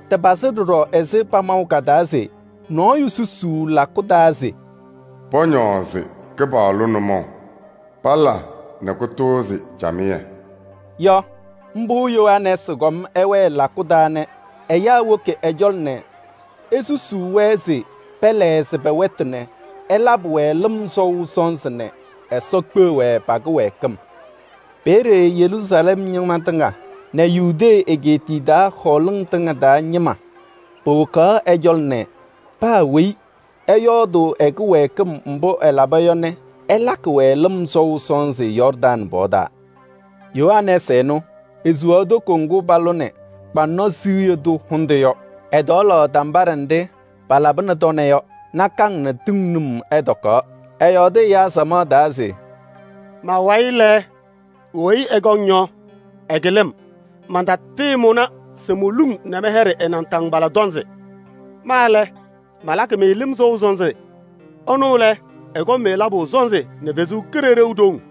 Tɩpazɩ ɖɔɖɔ ɛzɩ pamaʋ ka-taa se: “Nɔɔyʋ susuu lakʋ taa se pɔñɔɔzɩ Kɩpaɣlʋ nʋmɔʋ nɛ pala nɛ kʋtʋʋzɩ camɩyɛ” yɔ. Mbʋ Yohanɛɛsɩ kɔm ɛwɛɛ lakʋ taa nɛ ɛyaa woki ɛ-cɔlɔ nɛ esusuu-wɛ se pɛlɛɣzɩ wɛtʋ nɛ ɛlabɩ-wɛ lɩm sɔʋ sɔnzɩ nɛ Ɛsɔ kpeɣ-wɛ pa-kɩwɛɛkɩm. Peeye Yeruusalɛm ñɩma tɩŋa nɛ Yudee egeetiye taa hɔɔlɩŋ tɩŋa taa ñɩma powokaɣ ɛ-cɔlɔ nɛ paa weyi ɛyɔɔdʋʋ ɛ-kɩwɛɛkɩm mbʋ ɛlaba yɔ nɛ ɛlakɩ-wɛ lɩm sɔʋ sɔnzɩ Yɔɔrdaŋ pɔɔ taa. Yohanɛɛsɩ ɛnʋ, esuwaɣ toko ŋgʋ palʋnɩ kʋyʋndʋʋ kpaŋnɔ hʋndʋ yɔ. Ɛtɔɔlaɣ tambaɖɛ nɖɩ palabɩnɩ tɔnɛ yɔ, nakaŋ nɛ tɩŋ num ɛtɔkaɣ. Ɛyɔɔdɩ ɛyaa samaɣ taa se: “Ma-wayɩ lɛ, weyi ɛkɔŋ yɔ, ɛkɩlɩ-m. Mantatɩɩmʋna se moluŋ nɛ mɛyɛɖɩ ɛ-naataŋgbala tɔnzɩ. Ma lɛ, malakɩ-mɩ lɩm sɔʋ sɔnzɩ, ɛnʋ lɛ, ɛkɔŋ-mɩ labʋ sɔnzɩ nɛ Ɛsɔ Kalɩzaɣ haʋ.”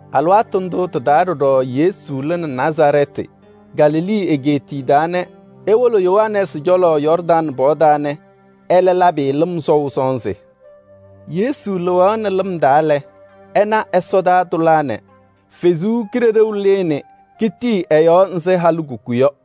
Alɩwaatʋ ndʋ tɩ-taa ɖɔɖɔ Yesu lɩnɩ Nazarɛɛtɩ, Galilee egeetiye taa nɛ ewolo Yohanɛɛsɩ cɔlɔ Yɔɔrdaŋ pɔɔ taa nɛ ɛlɛ labɩ-ɩ lɩm sɔʋ sɔnzɩ. Yesu lɩɣaɣnɩ lɩm taa lɛ, ɛna ɛsɔtɔnʋʋ tʋlaa nɛ Ɛsɔ Kalɩzaɣ lɩɩ nɛ ketiki ɛ-yɔɔ ɛzɩ halikuku yɔ.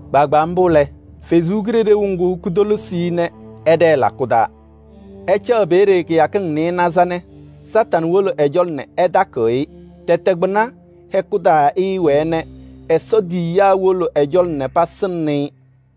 Kpaagbaa mbʋ lɛ, Ɛsɔ Kalɩzaɣ ŋga kotolisi-i nɛ ɛɖɛɛ lakʋ taa. Ɛcaɣ peeye kɩyakɩŋ nɩɩnaza nɛ Kañadʋ Satanɩ wolo ɛ-cɔlɔ nɛ ɛtakɩɣ-ɩ. Tɛtɛ kpɩna hɛkʋ taa ɛɛwɛɛ nɛ Ɛsɔ tiyiyaa wolo ɛ-cɔlɔ nɛ pasɩŋnɩ-ɩ.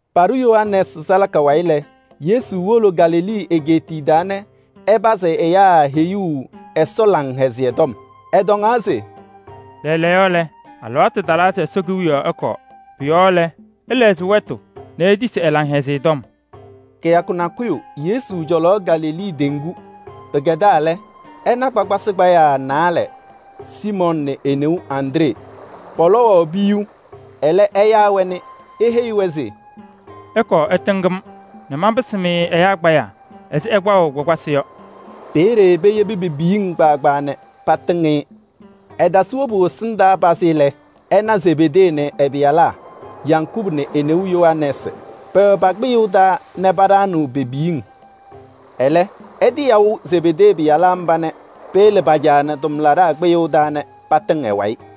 Paɖʋ Yohanɛɛsɩ salaka wayɩ lɛ, Yesu wolo Galilee egeetiye taa nɛ ɛpazɩ ɛyaa heyuu Ɛsɔ Laŋhɛzɩyɛ Tɔm. Ɛtɔŋaɣ se: “Lɛɛlɛɛyɔ, alɩwaatʋ talaa se Ɛsɔ Kewiyaɣ ɛkɔɔ. Pʋ-yɔɔ lɛ, ɩlɛɣzɩ wɛtʋ nɛ itisi ɛ-Laŋhɛzɩyɛ Tɔm.” Kɩyakʋ nakʋyʋ Yesu cɔlaɣ Galilee teŋgu. Pɩkɛdaa lɛ, ɛna kpakpasɩ kpayaa naalɛ: Siimɔɔ nɛ e-neu Andree, pɔlɔwaɣ piyuu. Ɛlɛ ɛyaa-wɛ nɛ eheyi-wɛ se: “Ɩkɔɔ ɩtɩŋ-m nɛ manpɩsɩ-mɩ ɛyaa kpayaa ɛzɩ ɩkpaɣʋ kpakpasɩ yɔ.” Peeye patiyebi pe-piyiŋ nɛ patɩŋ-ɩ. Ɛtasɩ wobu ɛsɩndaa pazɩ lɛ, ɛna Zebedee nɛ ɛ-pɩyalaa: Yakubu nɛ e-neu Yohanɛɛsɩ, pɛwɛ pa-kpɩyʋʋ taa nɛ paɖaɣnɩɣ pe-piyiŋ. Ɛlɛ, ɛtɩyaʋ Zebedee pɩyalaa mba nɛ peyele pa-caa nɛ tʋmlaɖaa kpɩyʋʋ taa nɛ patɩŋ ɛ-wayɩ.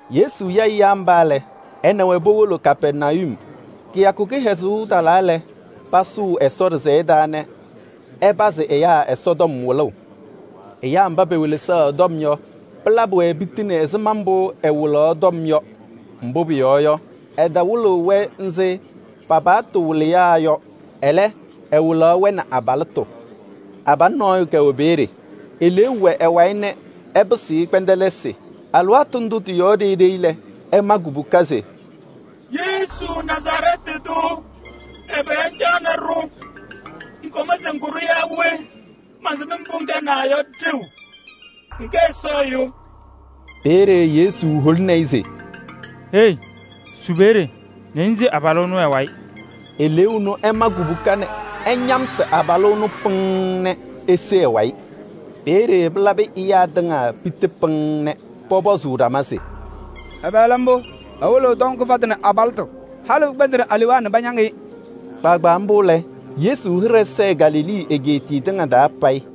Yesu ya ɛyaa mba lɛ, ɛ nɛ wɛ powolo Kapɛrnayum. Kɩyakʋ kɩhɛzʋʋ talaa lɛ, pasʋʋ Ɛsɔ ɖɩsɛyɛ taa nɛ ɛpazɩ ɛyaa Ɛsɔtɔm wɩlʋʋ. Ɛyaa mba pewelesaɣ ɛ-tɔm yɔ, pɩlabɩ-wɛ piti nɛ ɛzɩma mbʋ ɛwɩlaɣ yɔ. Mbʋ pʋyɔɔ yɔ, ɛtawɩlɩɣ-wɛ ɛzɩ pa-paɣtʋ wɩlɩyaa yɔ. Ɛlɛ, ɛwɩlaɣ-wɛ nɛ abalɩtʋ. Abalʋ nɔɔyʋ kɛwɛ peeye, eleeu wɛ ɛ-wayɩ nɛ ɛpɩsɩɣ-ɩ kpɛndɛlɩsɩ. Alɩwaatʋ ndʋ tɩ-yɔɔ ɖeyi ɖeyi lɛ, ɛma kubuka se: “Yesu Nazarɛɛtɩ tʋ, ɛbɛ ŋcaɣnɩ-ɖʋ? Ŋkɔm se ŋkʋ-ɖʋ yaa we? Mansɩm mbʋ ŋkɛnaa yɔ ɖeu, ŋkɛ Ɛsɔ Ɛyʋ.” Peeye Yesu holini-i se: “Hei! Su peeye nɛ ŋse abalʋ ɛnʋ ɛ-wayɩ.” Eleeu ɛnʋ ɛma kubuka nɛ ɛñamsɩ abalʋ ɛnʋ pɩŋŋ nɛ ese ɛ-wayɩ. Peeye pɩlabɩ ɛyaa tɩŋa piti pɩŋŋ nɛ pɔpɔzʋʋ ɖama se: “Ɛbɛ lɛ mbʋ? Ɛwɩlɩɣ tɔm kɩfatʋ nɛ abalɩtʋ! Halɩ pɩkpɛndɩnɩ alewaa nɛ pañaŋ-ɩ.” Kpaagbaa mbʋ lɛ, Yesu hɩɖɛ sɛɛ Galilee egeetiye tɩŋa payɩ.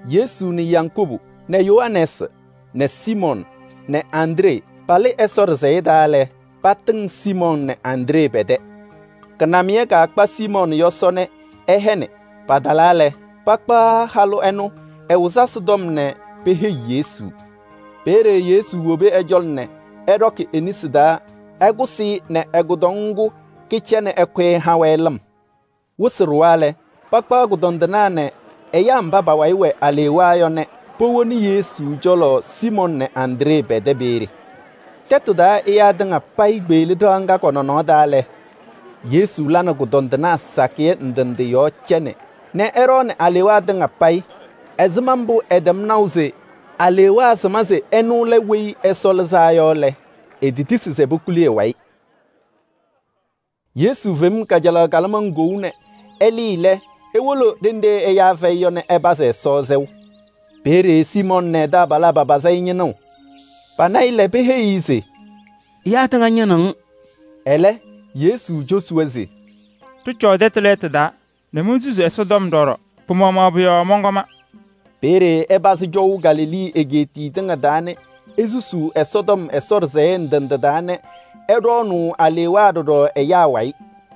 Yesu nɛ Yakubu nɛ Yohanɛɛsɩ nɛ Siimɔɔ nɛ Andree palɩ Ɛsɔ ɖɩsɛyɛ taa lɛ, patɩŋ Siimɔɔ nɛ Andree pɛ-tɛ. Kɩnamɩyɛ kakpa Siimɔɔ yɔsɔ nɛ ɛhɛnɩ. Patalaa lɛ, pakpaɣ halʋ ɛnʋ ɛ-wɩzasɩ tɔm nɛ peheyi Yesu. Peeye Yesu wobi ɛ-cɔlɔ nɛ ɛɖɔkɩ e-nesi taa ɛkʋsɩ-ɩ nɛ ɛ-kʋdɔŋ ŋgʋ kɩcɛ nɛ ɛkʋyɩ ɛha-wɛ lɩm. Wɩsɩ ɖʋwa lɛ, pakpaɣ kʋdɔndɩnaa nɛ ɛyaa mba pa-wayɩ wɛ alewaa yɔ nɛ powoni-wɛ Yesu cɔlɔ Siimɔɔ nɛ Andree pɛ-tɛ peeye. Tɛtʋ taa ɛyaa tɩŋa payɩ kpeɣli ɖɩɣa ŋga kɔ-nɔnɔɔ taa lɛ, Yesu la nɛ kʋdɔndɩnaa sakɩyɛ ndɩ ndɩ yɔɔ cɛ nɛ ɛɖɔɔnɩ alewaa tɩŋa payɩ. Ɛzɩma mbʋ ɛtɛm naʋ se alewaa sɩma se ɛnʋ lɛ Weyi Ɛsɔ Lɩzaa Yɔ lɛ, etetisi se pokuli ɛ-wayɩ. Yesu fem kajalaɣ kalɩmaŋ kou nɛ ɛlɩɩ lɛ, ewolo ɖenɖe ɛyaa fɛyɩ yɔ nɛ ɛpazɩ Ɛsɔ sɛʋ. Peeye Siimɔɔ nɛ ɛ-taabalaa papazɩ-ɩ ñɩnʋʋ. Pana-ɩ lɛ, peheyi-i se: “Ɛyaa tɩŋa ñɩnɩɣ-ŋ.” Ɛlɛ, Yesu cosi-wɛ se: “Ɖɩcɔɔ tɛtʋ lɛɛtʋ taa nɛ monsusi Ɛsɔtɔm ɖɔɖɔ. Pɩ-maɣmaɣ pʋ-yɔɔ mɔnkɔma.” Peeye ɛpazɩ cɔʋ Galilee egeetiye tɩŋa taa nɛ esusuu Ɛsɔtɔm Ɛsɔ ɖɩsɛyɛ ndɩ ndɩ taa nɛ ɛɖɔɔnʋʋ alewaa ɖɔɖɔ ɛyaa wayɩ.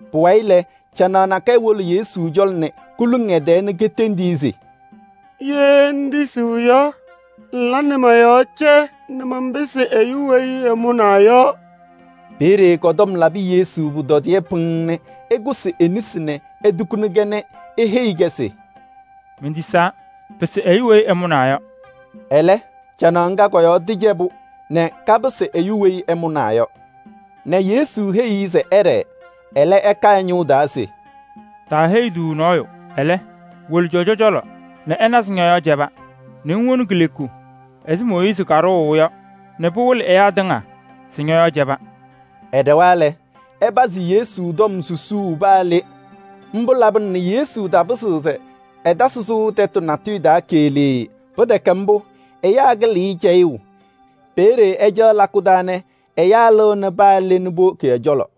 Pʋwayɩ lɛ, canaɣ nakɛyɛ wolo Yesu cɔlɔ nɛ koluŋ ɛ-tɛɛ nɛ ketendi-i se: “Ye ŋtisiɣ yɔ, ŋla nɛ mɔ-yɔɔ cɛ nɛ manpɩsɩ ɛyʋ weyi ɛmʋnaa yɔ.” Peeye kɔ-tɔm labɩ Yesu pʋtɔdɩyɛ pɩŋŋ nɛ ɛkʋsɩ e-nesi nɛ etukuni-kɛ nɛ eheyi-kɛ se: “Mentisaa, pɩsɩ ɛyʋ weyi ɛmʋnaa yɔ.” Ɛlɛ, canaɣ ŋga kɔ-yɔɔ tɩcɛbʋ nɛ kapɩsɩ ɛyʋ weyi ɛmʋnaa yɔ nɛ Yesu heyi-i se ɛɖɛɛ. Ɛlɛ ɛka ɛ-ñʋʋ taa se: “Taaheyi-tʋ nɔɔyʋ. Ɛlɛ, wolo cɔjɔ cɔlɔ nɛ ɛna se ñɔ-yɔɔ cɛba, nɛ ŋwoni kileku ɛzɩ Mooyiizi kadʋʋ yɔ nɛ pɩwɩlɩ ɛyaa tɩŋa se ñɔ-yɔɔ cɛba.” Ɛɖɛwa lɛ, ɛpazɩ Yesu tɔm susuu paa le. Mbʋ labɩna nɛ Yesu tapɩzɩɣ se ɛtasɩ sʋʋ tɛtʋ natʋyʋ taa keɣlee. Pɩtɛkɛ mbʋ, ɛyaa kɩlɩɣ-ɩ cɛyʋʋ. Peeye ɛcaɣ lakʋ taa nɛ ɛyaa lɩɣnɩ paa le nɛ powoki ɛ-cɔlɔ.